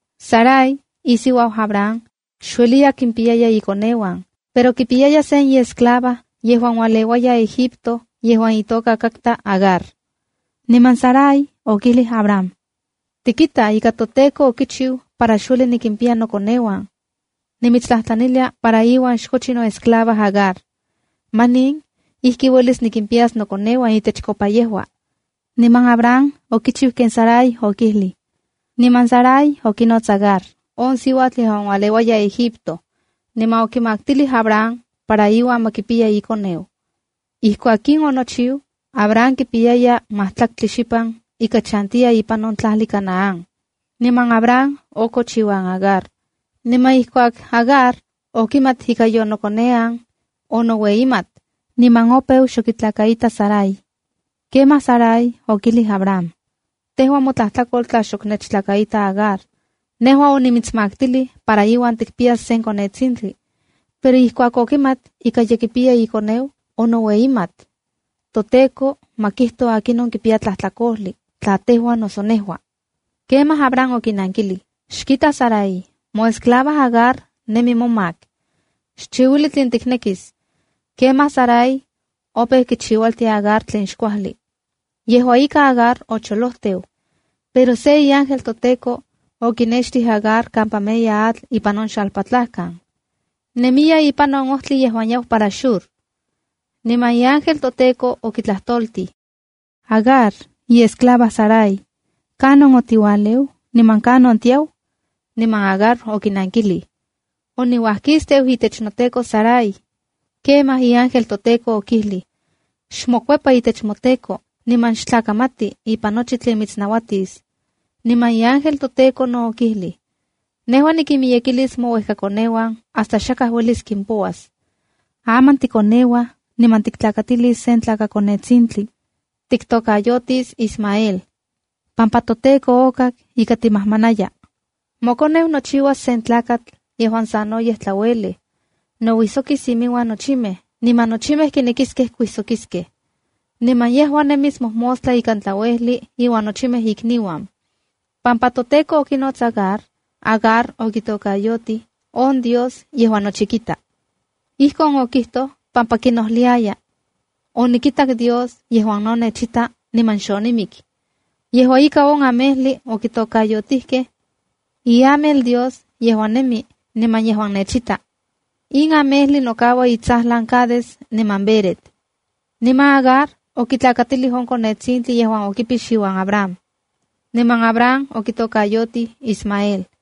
Sarai, isiuau Abram, xueliya kimpiyaya ikoneuan, pero kipiyaya sen iesclava yejuan ualeua Egipto yejuan itoka katka Agar. Niman Sarai okijlij Abram: —Tikita ika toTEKO okichiu para xueli nikimpiya nokoneuan. Nimitstlajtlanilia para iuan xkochi noesclava Agar. Manin ijki uelis nikimpayas nokoneuan itechkopa yejua. Niman Abram okichiu ken Sarai okijlij. Niman Sarai okinots Agar, on siuatl yejuan ualeua Egipto, niman okimaktilij Abram para iuan ma kipiya ikoneu. Ijkuak in onochiu, Abram kipiyaya majtlaktli xipan ika chantiya ipan on tlajli Canaán. Niman Abram okoch iuan Agar. Niman ijkuak Agar okimat ika yonokonean, onoueyimat niman opeu xok kitlakaita Sarai. Kemaj Sarai okijlij Abram: —Tejua motlajtlakol tla xok nechtlakaita Agar. Nejua onimitsmaktilij para iuan tikpiyas se konetsintli, pero ijkuak okimat ika ye kipiya ikoneu, onoueyimat. ToTEKO ma kijto akinon kipiya tlajtlakojli, tla tejua noso nejua. Kemaj Abram okinankilij: —Xkita Sarai, moesclava Agar nemi momak. Xchiuili tlen tiknekis. Kemaj Sarai opeu kichiualtia Agar tlen xkuajli. Yejua ika, Agar ocholojteu. Pero se iángel toTEKO okinextij Agar kampa meya atl ipan on xalpatlajkan. Nemiya ipan on ojtli yejuan yau para Shur. Niman iángel toTEKO okitlajtoltij: —Agar, iesclava Sarai, ¿kanon otiualeu niman kanon tiau? Niman Agar okinankilij: —Oniuajkisteu itech noteko Sarai. Kemaj iángel toTEKO okijlij: —Xmokuepa itech moteko niman xtlakamati ipan nochi tlen mitsnauatis. Niman iángel toTEKO no okijlij: “Nejua nikinmiyekilis mouejkakoneuan hasta xakaj uelis kimpouas. Aman tikoneuaj niman tiktlakatilis sen tlakakonetsintli. Tiktokayotis Ismaela, pampa toTEKO okak ika timajmanaya. Mokoneu nochiuas sen tlakatl yejuan sanoyej tlauelej. Nouijsokis iminuan nochimej, niman nochimej kinekiskej kuijsokiskej. Niman yejua nemis mojmostla ikan tlauejli iuan nochimej ikniuan.” Pampa toTEKO okinots Agar, Agar okitokayotij: “On Dios yejuan nochi kita.” Ijkon okijtoj pampa kinojliaya: “Onikitak Dios yejuan no nechita niman xonimik.” Yejua ika, on amejli okitokayotijkej: “Iamel Dios yejuan Nemi niman yejuan Nechita.” In amejli nokaua itsajlan Cades niman Bered. Niman Agar okitlakatilij on konetsintli yejuan okipix iuan Abram. Niman Abram okitokayotij Ismael.